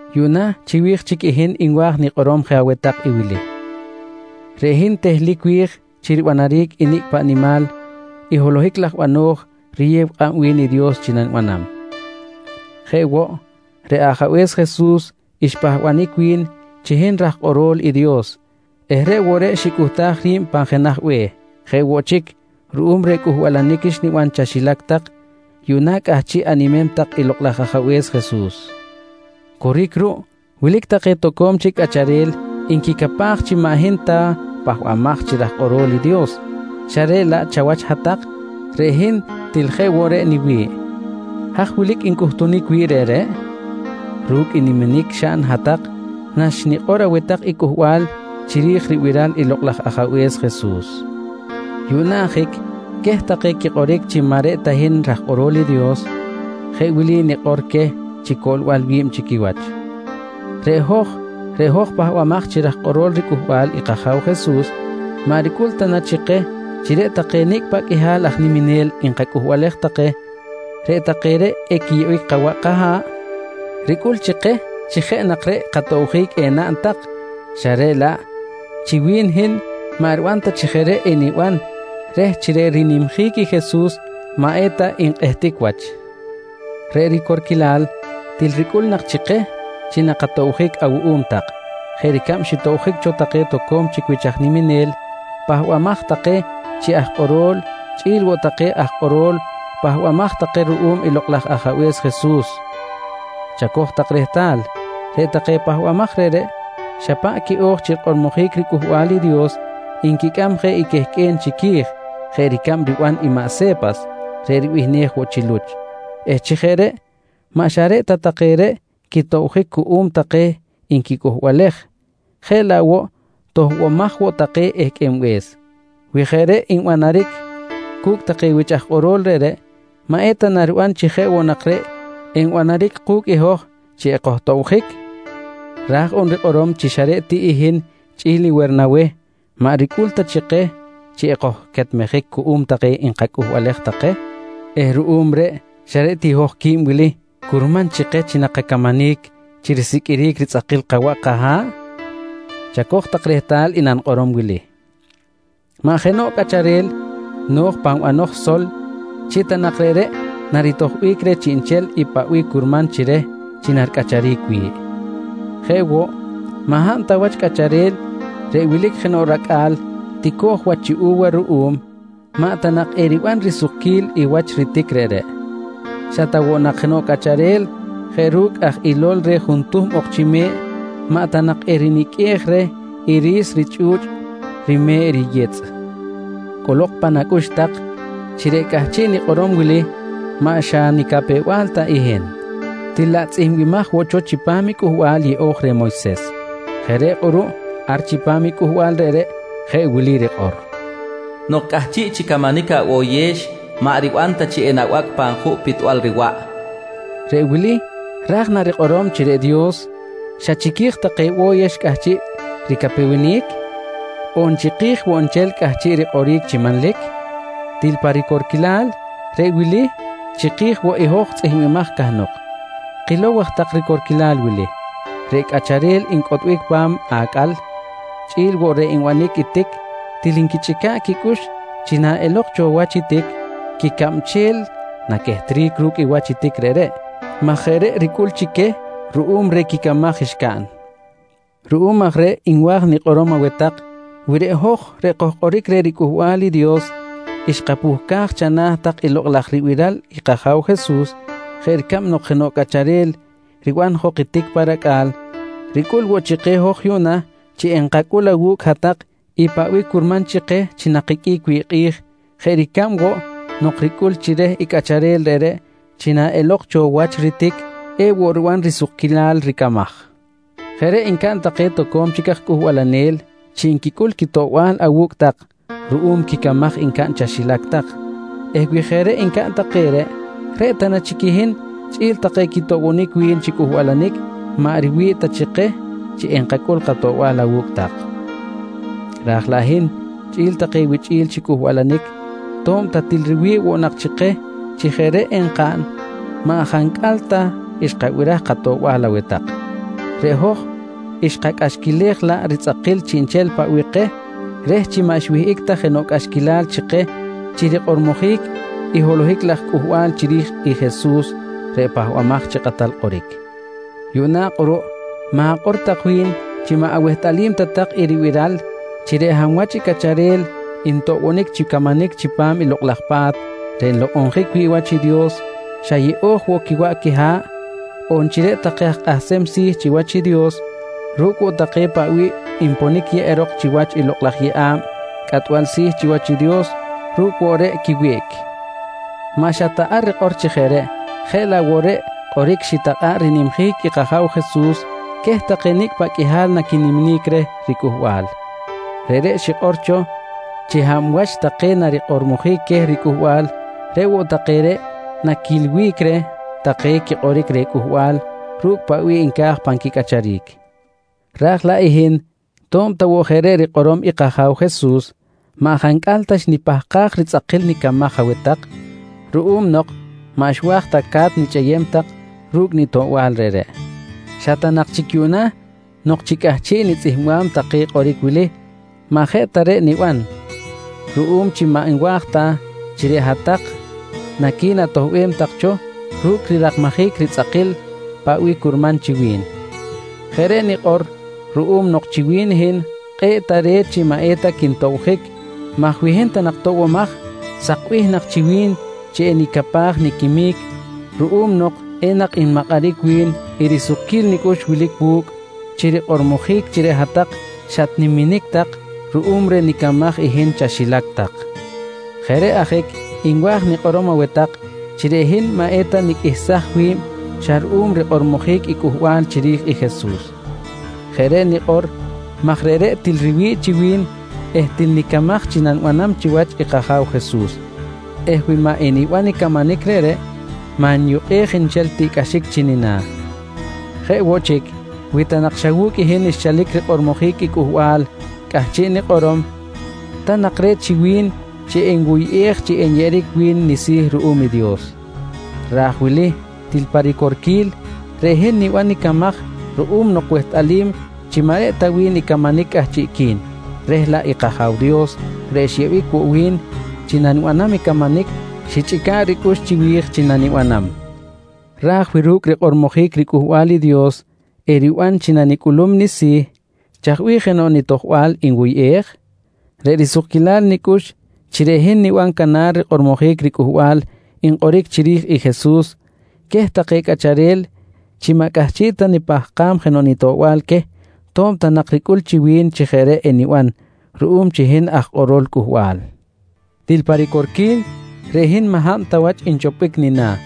Yuꞌna chiwi̱j chic i hin nwa̱j nikꞌorom je aweh take wili: Reꞌ hin tehlic wi̱j chi ribanaric i nicꞌ paꞌ nimal i holohic laj bano̱j riyew kꞌab wi̱n i Dios chi nanibanam. Jeꞌ woꞌ reꞌ Ajabe̱s Jesus xpahbanic wi̱n chi hin raj kꞌoro̱l i Dios eh reꞌ woꞌ reꞌ xicꞌuhtaj ri̱b wi̱n pan jenaj be̱h. Jeꞌ woꞌ chic ruꞌum reh cꞌuhbalanic xniban chaxilac tak yuꞌna cꞌahchiꞌ animem tak i Lokꞌ laj Ajabe̱s Jesus. Coric ruꞌ wilic take toco̱m chic cꞌacharel nquicapaj chi maꞌ hin ta pahbamaj chi raj kꞌoro̱l i Dios xa reꞌ laꞌ chawach hat-tak, reꞌ hin til jeꞌ woꞌ reꞌ niwi̱ꞌ. Haj wilic ncꞌutunic wi̱ꞌ reꞌreꞌ? Ru̱cꞌ i niminic xaꞌn hat-tak naxnikꞌor aweh tak i cꞌuhbal chiri̱j ribiral i Lokꞌ laj Ajabe̱s Jesus. Yuꞌna ajic queh take quikꞌoric chi maꞌ ta reꞌ hin raj kꞌoro̱l i Dios, jeꞌ wili nikꞌor queh chi coꞌlbal wi̱b chi quiwach: Reꞌ hoj reꞌ hoj pahbamaj chi raj kꞌoro̱l riCꞌuhbal i kAja̱w Jesus, maꞌ ricꞌul ta nak chi keh chi reꞌ take nicꞌ paꞌ qꞌuihal aj niminel nkacꞌuhbalej take, reꞌ take reꞌ equiyeꞌbic kawaꞌ kaha̱ꞌ? Ricꞌul chi keh chi jeꞌ nak reꞌ katobjic enaꞌn tak xa reꞌ laꞌ chi wi̱n hin maꞌ riban ta chi jeꞌ reꞌ eniban reh chi reꞌ rinimjic i Jesus maꞌ eta nkꞌehtic wach. Reꞌ ricorquilal, til ricꞌul nak chi keh chi nakatobjic awuꞌum tak jeꞌ ricab xitobjic cho take toco̱m chic wich aj niminel pahbamaj take chi aj kꞌoro̱l chꞌi̱l woꞌ take aj kꞌoro̱l pahbamaj take ruꞌum i Lokꞌ laj Ajabe̱s Jesus. Chacoj tak rehtal reꞌ take pahbamaj reꞌreꞌ, xa paꞌ quiꞌo̱j chi rikꞌormojic riCꞌuhbal i Dios nquicꞌam je i quehqꞌue̱n chiqui̱j jeꞌ ricab riban i maꞌ Se̱pas reꞌ ribihnej woꞌ chi Luch eh chi jeꞌ reꞌ maꞌ xa reꞌ ta take reꞌ quitobjic cuꞌum take nquicꞌuhbalej jeꞌ laꞌ woꞌ toꞌbomaj woꞌ take ehqꞌuenbe̱s. Wi jeꞌ reꞌ nbanaric cu̱cꞌ take wich aj kꞌorol reꞌreꞌ, maꞌ eta na riban chi jeꞌ woꞌ nak reꞌ enbanaric ku̱cꞌ i hoj chi ekojtobjic? Raj on rikꞌorom chi xa reꞌ ti hin chꞌi̱l i Wernaweh maꞌ ricꞌul ta chi keh chi ekojquetmejic cuꞌum take nkacꞌuhbalej take eh ruꞌum reꞌ xa reꞌ ti hoj quib wili curman chi keh chi nakacamanic chi risiqꞌuiric ritzꞌakil kawaꞌ kaha̱ꞌ? Chacoj tak rehtal i nanikꞌorom wili: Maꞌ jenoꞌ cꞌacharel no̱j pan banoj sol chi ta nak reꞌreꞌ naritojbic reh chiꞌnchel i paꞌ bih curman chi reh chi naricꞌacharic wi̱ꞌ. Jeꞌ woꞌ maꞌ hab ta wach cꞌacharel reꞌ wilic jenoꞌ racꞌa̱l tico̱j wach chi u̱wa ruꞌum, maꞌ ta nak eriban risukquil i wach ritic reꞌreꞌ. Xa ta woꞌ nak jenoꞌ cꞌacharel jeꞌ ru̱cꞌ aj ilol reh juntuhm ok chi me̱ꞌ maꞌ ta nak eriniqꞌuej reh i ri̱s richꞌu̱chꞌ rime̱ꞌ riyitzꞌ. Cꞌolok pan acꞌux tak chi reꞌ cꞌahchiꞌ nikꞌorom wili maꞌ xa nicapew-bal ta i hin, til laꞌ tzꞌihmbimaj woꞌ cho chipam i Cꞌuhbal Yeꞌo̱j reh i Moyses. Jeꞌ reꞌ kꞌuruꞌ ar chipam i cꞌuhbal reꞌreꞌ jeꞌ wili rikꞌor: “Nok cꞌahchiꞌ chi camanic aboyex maꞌ riban ta chi enabacꞌ pan juꞌ pitbal riwaꞌ, nqui rikꞌor. Reꞌ wili ra̱j na rikꞌorom chi reꞌ Dios xa chiqui̱j take bo̱yex cꞌahchiꞌ ricapewenic? On chiki̱j woꞌ nchel cꞌahchiꞌ rikꞌoric chi manlic? Til pa ricorquilal, reꞌ wili chiki̱j woꞌ i hoj tzꞌihmbimaj cahnok. Kilow aj tak ricorquilal wili: Reꞌ cꞌacharel ncꞌotbic pa̱m acꞌal chꞌi̱l woꞌ reꞌ nbanic i tic til nquichꞌica̱ꞌ quicꞌux chi na elok cho wach i tic, quicabchel naquehtric ru̱cꞌ i wach i tic reꞌreꞌ maj jeꞌ reꞌ ricꞌul chi queh ruꞌum reh quicamaj xcaꞌn. Ruꞌum aj reꞌ nwa̱j nikꞌorom aweh tak, wi reꞌ hoj reꞌ kojkꞌoric reh riCꞌuhbal i Dios xkapuhcaj chana̱ tak i lokꞌ laj ribiral i kAja̱w Jesus jeꞌ ricab nok jenoꞌ cꞌacharel riban jok i tic pa racꞌa̱l, ricꞌul woꞌ chi keh hoj yuꞌna chi enkacꞌul awu̱cꞌ hat-tak i paꞌ bih curman chi keh chi nakiqꞌuic wi̱ꞌ kꞌi̱j jeꞌ ricab woꞌ nok ricꞌul chi reh i cꞌacharel reꞌreꞌ chi naꞌelok cho wach ritic, ewoꞌ riban risukquilal ricamaj. Jeꞌ reꞌ ncaꞌn take toco̱m chic aj cꞌuhbalanel chi nquicꞌul quitoꞌbal awu̱cꞌ tak ruꞌum quicamaj ncaꞌn chaxilac tak eh wi jeꞌ reꞌ ncaꞌn take reꞌ, reꞌ ta na chic i hin chꞌi̱l take quitoꞌbonic wi̱n chi cꞌuhbalanic maꞌ riwi̱ꞌ ta chi keh chi enkacꞌul katoꞌbal awu̱cꞌ tak? Raj laꞌ i hin chꞌi̱l take wichꞌi̱l chi cꞌuhbalanic to̱b ta til riwi̱ꞌ woꞌ nak chi keh chi jeꞌ reꞌ enkaꞌn, maꞌ jancꞌal ta xkabiraj katoꞌbal aweh tak. Reꞌ hoj xkacꞌaxquilej laꞌ ritzꞌakil chiꞌnchel paꞌ bih keh reh chi maꞌ xwihꞌic ta jenoꞌ cꞌaxquilal chi keh chi rikꞌormojic i holohic laj cꞌuhbal chiri̱j i Jesus reꞌ Pahbamaj chi Kꞌatal Kꞌoric. Yuꞌna kꞌuruꞌ ma̱kꞌor tak wi̱n chi maꞌ awehtꞌalim ta tak i ribiral chi reꞌ hab wach i cꞌacharel ntoꞌbonic chi camanic chipam i Lokꞌ laj Pa̱t reꞌ nlokꞌonjic wi̱ꞌ wach i Dios xa yeꞌo̱j woꞌ quiwaꞌ quiha̱ꞌ on chi reꞌ take aj kꞌahsem si̱ chiwach i Dios ru̱cꞌ woꞌ take paꞌ bih nponic yeꞌerok chiwach i lokꞌ laj yeꞌa̱b cꞌatbal si̱ chiwach i Dios, ru̱cꞌ woꞌ reꞌ quiwiꞌc. Maꞌ xa ta ar rikꞌor chi jeꞌ reꞌ, jeꞌ laꞌ woꞌ reꞌ kꞌoric xitakꞌa̱ꞌ rinimjic i kAja̱w Jesus queh nicꞌ paꞌ qꞌuihal naquiniminic reh riCꞌuhbal. Reꞌreꞌ xikꞌor cho chi hab wach take narikꞌormojic queh riCꞌuhbal, reꞌ woꞌ take reꞌ naquilbic reh take quikꞌoric reh cꞌuhbal ru̱cꞌ paꞌ bih nca̱j pan quicꞌacharic. Raj laꞌ i hin to̱b ta woꞌ jeꞌ reꞌ rikꞌorom i kAja̱w Jesus, maꞌ jancꞌal ta xnipahkaj ritzꞌakil nicamaj aweh tak ruꞌum nok maꞌ xwa̱j ta ca̱t nichꞌeyem tak ru̱cꞌ nitoꞌbal reꞌreꞌ. Xa ta nak chic yuꞌna nok chi cꞌahchiꞌ nitzꞌihmbam take kꞌoric wili, maꞌ jeꞌ ta reꞌ niban ruꞌum chi maꞌ nwa̱j ta chi reꞌ hat-tak naqui̱natoꞌbem tak cho ru̱cꞌ rirakmajic ritzꞌakil paꞌ bih curman chi wi̱n. Jeꞌ reꞌ nikꞌor ruꞌum nok chi wi̱n i hin kꞌe̱ꞌ tare̱t chi maꞌ eta quintobjic maj wi hin ta nak toꞌbomaj, sakbih nak chi wi̱n chi enicapaj niquimic ruꞌum nok enak nmakꞌaric wi̱n i risukquil nicꞌux wilic wu̱cꞌ chi rikꞌormojic chi reꞌ hat-tak xatniminic tak ruꞌum reh nicamaj i hin chaxilac tak. Jeꞌ reꞌ ajic nwa̱j nikꞌorom aweh tak chi reꞌ hin maꞌ eta niqꞌuihsaj wi̱b xa ruꞌum rikꞌormojic i cꞌuhbal chiri̱j i Jesus. Jeꞌ reꞌ nikꞌor maj reꞌreꞌ til riwi̱ꞌ chi wi̱n eh til nicamaj chi nanibanam chiwach i kAja̱w Jesus eh wi maꞌ eniban i camanic reꞌreꞌ maꞌ nyukꞌej nchel tiꞌcꞌaxic chi nina̱. Jeꞌ woꞌ chic wi ta nak xa wu̱cꞌ i hin xchalic rikꞌormojic i cꞌuhbal cꞌahchiꞌ nikꞌorom, ta nak re̱t chi wi̱n chi enwuyꞌej chi enyeꞌeric wi̱n nisi̱ ruꞌum i Dios. Ra̱j wili til pa ricorquil, reꞌ hin niban nicamaj ruꞌum nok wehtꞌalim chi maꞌ reꞌ ta wi̱n i camanic cꞌahchiꞌqui̱n, reh laꞌ i kAja̱w Dios reꞌ xyeꞌbic woꞌ wi̱n chi nanibanam i camanic xichꞌica̱ꞌ ricꞌux chiwi̱j chi nanibanam. Raj wi ru̱cꞌ rikꞌormojic riCꞌuhbal i Dios eriban chi nanicꞌulum nisi̱, chaj bih jenoꞌ nitojbal nwuyꞌej? Reꞌ risukquilal nicꞌux chi reꞌ hin niban canar rikꞌormojic ricꞌuhbal nkꞌoric chiri̱j i Jesus queh take cꞌacharel chi maꞌ cꞌahchiꞌ ta nipahkam jenoꞌ nitoꞌbal queh to̱b ta nak ricꞌul chi wi̱n chi jeꞌ reꞌ eniban ruꞌum chi hin aj kꞌorol cꞌuhbal. Til pa ricorquil, reꞌ hin maꞌ hab ta wach nchopbic nina̱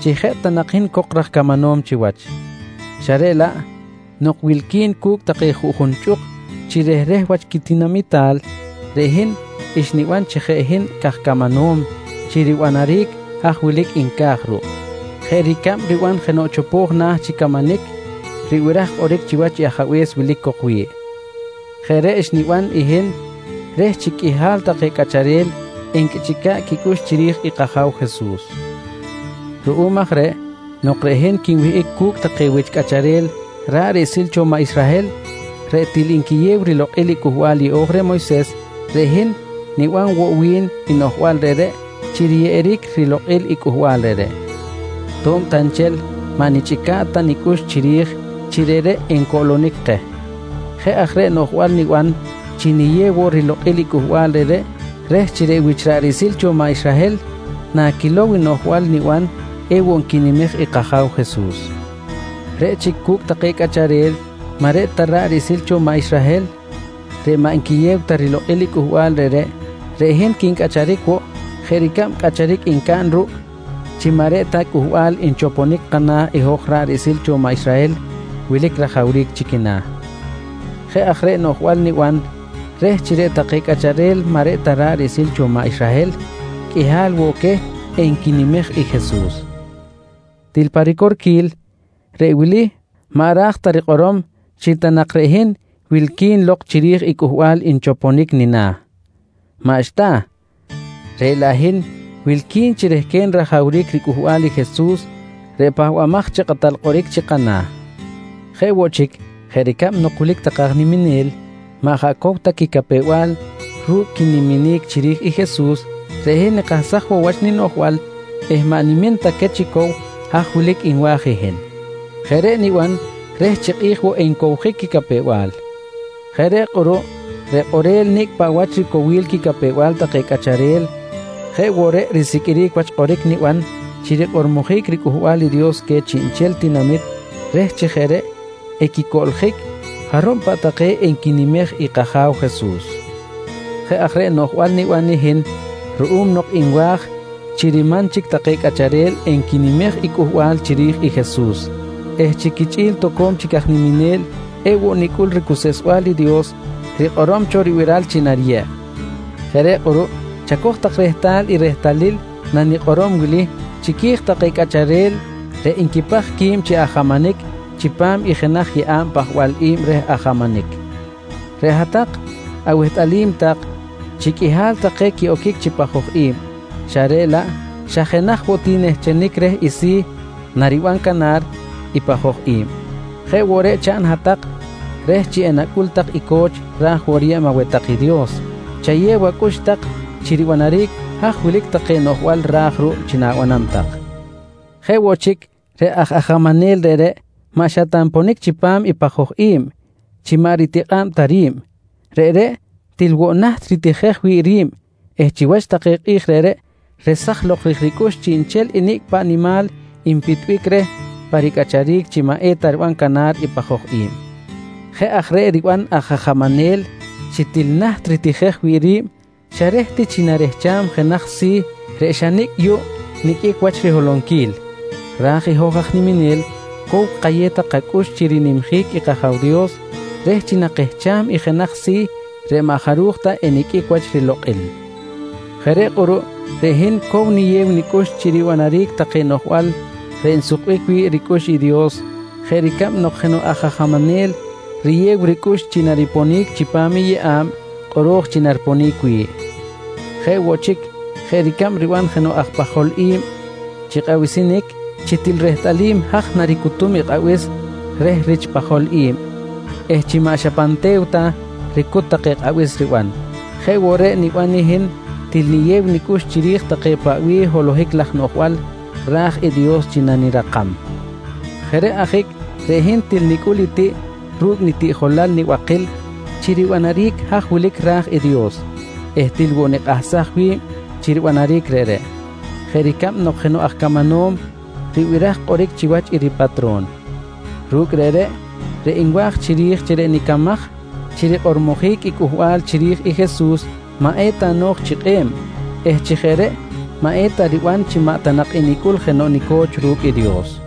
chi jeꞌ ta nak hin cok raj camanom chiwach, xa reꞌ laꞌ nok wilqui̱n cu̱cꞌ take juꞌjun chꞌuk chi rehreh wach quitinamital, reꞌ hin xniban chi jeꞌ hin caj camanom chi ribanaric haj wilic nca̱j ruꞌ jeꞌ ricab riban jenoꞌ chopo̱j chi camanic ribiraj kꞌoric chiwach i ajabe̱s wilic cok wi̱ꞌ. Jeꞌ reꞌ xniban i hin reh chi qꞌuihal take cꞌacharel enquichꞌica̱ꞌ quicꞌux chiri̱j i kAja̱w Jesus. Ruꞌum aj reꞌ nok reꞌ hin quinwihꞌic cu̱cꞌ take wich cꞌacharel ra̱ꞌ riꞌsil cho maꞌ Israhel reꞌ til nquiyew rilokꞌil i Cꞌuhbal Yeꞌo̱j reh Moyses, reꞌ hin niban woꞌ wi̱n i noꞌjbal reꞌreꞌ chi riyeꞌeric rilokꞌil i cꞌuhbal reꞌreꞌ, to̱b ta nchel maꞌ nichꞌica̱ꞌ ta nicꞌux chiri̱j chi reꞌreꞌ encoꞌlonic keh. Jeꞌ aj reꞌ noꞌjbal niban chi niyew woꞌ rilokꞌil i cꞌuhbal reꞌreꞌ reh chi reꞌ wich ra̱ꞌ riꞌsil cho maꞌ Israhel nanquilow i noꞌjbal niban ewoꞌ nquinimej i kAja̱w Jesus. Reꞌ chic cu̱cꞌ take cꞌacharel maꞌ reꞌ ta ra̱ꞌ riꞌsil cho maꞌ Israhel reꞌ maꞌ nquiyew ta rilokꞌil i cꞌuhbal reꞌreꞌ, reꞌ hin quincꞌacharic woꞌ jeꞌ ricab cꞌacharic ncaꞌn ruꞌ chi maꞌ reꞌ ta cꞌuhbal nchoponic kana̱ i hoj ra̱ꞌ riꞌsil cho maꞌ Israhel wilic rajawric chi quina̱. Jeꞌ aj reꞌ noꞌjbal niban reh chi reꞌ take cꞌacharel maꞌ reꞌ ta ra̱ꞌ riꞌsil cho maꞌ Israhel qꞌuihal woꞌ queh enquinimej i Jesus. Til pa ricorquil, reꞌ wili maꞌ ra̱j ta rikꞌorom chi ta nak reꞌ hin wilqui̱n lok chiri̱j i cꞌuhbal nchoponic nina̱. Maꞌxta, reꞌ laꞌ hin wilqui̱n chi rehquen rajawric ricꞌuhbal i Jesus reꞌ Pahbamaj chi Kꞌatal Kꞌoric chi kana̱. Jeꞌ woꞌ chic jeꞌ ricab nok wilic take aj niminel maꞌ jaꞌ cow ta quicapew-bal ru̱cꞌ quiniminic chiri̱j i Jesus, reꞌ hin nikahsaj woꞌ wach ninoꞌjbal eh maꞌ nimin ta queh chi cow haj wilic nwa̱j i hin. Jeꞌ reꞌ niban reh chi kꞌi̱j woꞌ encowjic quicapew-bal. Jeꞌ reꞌ kꞌuruꞌ reꞌ kꞌorel nicꞌ paꞌ wach ricowil quicapew-bal take cꞌacharel, jeꞌ woꞌ reꞌ risiqꞌuiric wach kꞌoric niban chi rikꞌormojic riCꞌuhbal i Dios queh chiꞌnchel tinamit reh chi jeꞌ reꞌ equicoꞌljic jarub paꞌ take enquinimej i kAja̱w Jesus. Jeꞌ aj reꞌ noꞌjbal niban i hin ruꞌum nok nwa̱j chi riman chic take cꞌacharel enquinimej i cꞌuhbal chiri̱j i Jesus eh chi quichꞌi̱l toco̱m chic aj niminel ewoꞌ nicꞌul ricuseꞌsbal i Dios rikꞌorom cho ribiral chi nariyeb. Jeꞌ reꞌ kꞌuruꞌ chacoj tak rehtal i rehtalil nanikꞌorom wili chiqui̱j take cꞌacharel reꞌ nquipaj qui̱b chi ajamanic chipam i jenaj yeꞌa̱b pajbal i̱b reh ajamanic. Reꞌ hat-tak awehtꞌalim tak chi qꞌuihal take quiꞌoquic chi pajoj i̱b xa reꞌ laꞌ xa jenaj woꞌ ti nehchenic reh i si̱ nariban canar i pajoj i̱b. Jeꞌ woꞌ reꞌ chaꞌn hat-tak, reh chi enacꞌul tak i co̱ch ra̱j woꞌ riyeb aweh tak i Dios chayew acꞌux tak chi ribanaric haj wilic take noꞌjbal ra̱j ruꞌ chi na̱banam tak. Jeꞌ woꞌ chic, reꞌ aj ajamanel reꞌreꞌ maꞌ xa ta nponic chipam i pajoj i̱b chi maꞌ ritikꞌa̱b ta ri̱b. Reꞌreꞌ til woꞌ naht ritijej wi̱ꞌ ri̱b eh chiwach take kꞌi̱j reꞌreꞌ resaj lok ri̱j ricꞌux chiꞌnchel i nicꞌ paꞌ nimal enpitbic reh pa ricꞌacharic chi maꞌ eta riban canar i pajoj i̱b. Jeꞌ aj reꞌ riban aj ajamanel chi til naht ritijej wi̱ꞌ ri̱b xa reh ti chi narehcham jenaj si̱ reꞌ xa nicꞌ yuꞌ niqꞌuic wach riholonquil, raj i hoj aj niminel cow kayew tak kacꞌux chi rinimjic i kAja̱w Dios reh chi nakehcham i jenaj si̱ reꞌ maꞌ jaruj ta eniqꞌuic wach rilokꞌil. Jeꞌ reꞌ kꞌuruꞌ reꞌ hin cow niyew nicꞌux chi ribanaric take noꞌjbal reꞌ nsukbic wi̱ꞌ ricꞌux i Dios jeꞌ ricab jenoꞌ aj ajamanel riyew ricꞌux chi nariponic chipam i yeꞌa̱b kꞌoro̱j chi nariponic wi̱ꞌ. Jeꞌ woꞌ chic jeꞌ ricab riban jenoꞌ aj pajol i̱b chi kꞌabisinic chi til rehtꞌalim aj naricutum i kꞌabis reh rich pajol i̱b eh chi maꞌ xa pan te̱w ta ricut take kꞌabis riban, jeꞌ woꞌ reꞌ niban i hin til niyew nicꞌux chiri̱j take paꞌ bih holohic laj noꞌjbal ra̱j i Dios chi nanirakam. Jeꞌ reꞌ ajic reꞌ hin til nicꞌul i tiꞌ ru̱cꞌ nitiꞌjolal nibakil chi ribanaric haj wilic ra̱j i Dios eh til woꞌ nikꞌahsaj wi̱b chi ribanaric reꞌreꞌ, jeꞌ ricab nok jenoꞌ aj camanom ribiraj kꞌoric chiwach i ripatro̱n. Ru̱cꞌ reꞌreꞌ, reꞌ nwa̱j chiri̱j chi reꞌ nicamaj chi rikꞌormojic i cꞌuhbal chiri̱j i Jesus maꞌ eta no̱j chi kꞌe̱b eh chi jeꞌ reꞌ maꞌ eta riban chi maꞌ ta enicꞌul jenoꞌ nico̱ch ru̱cꞌ i Dios.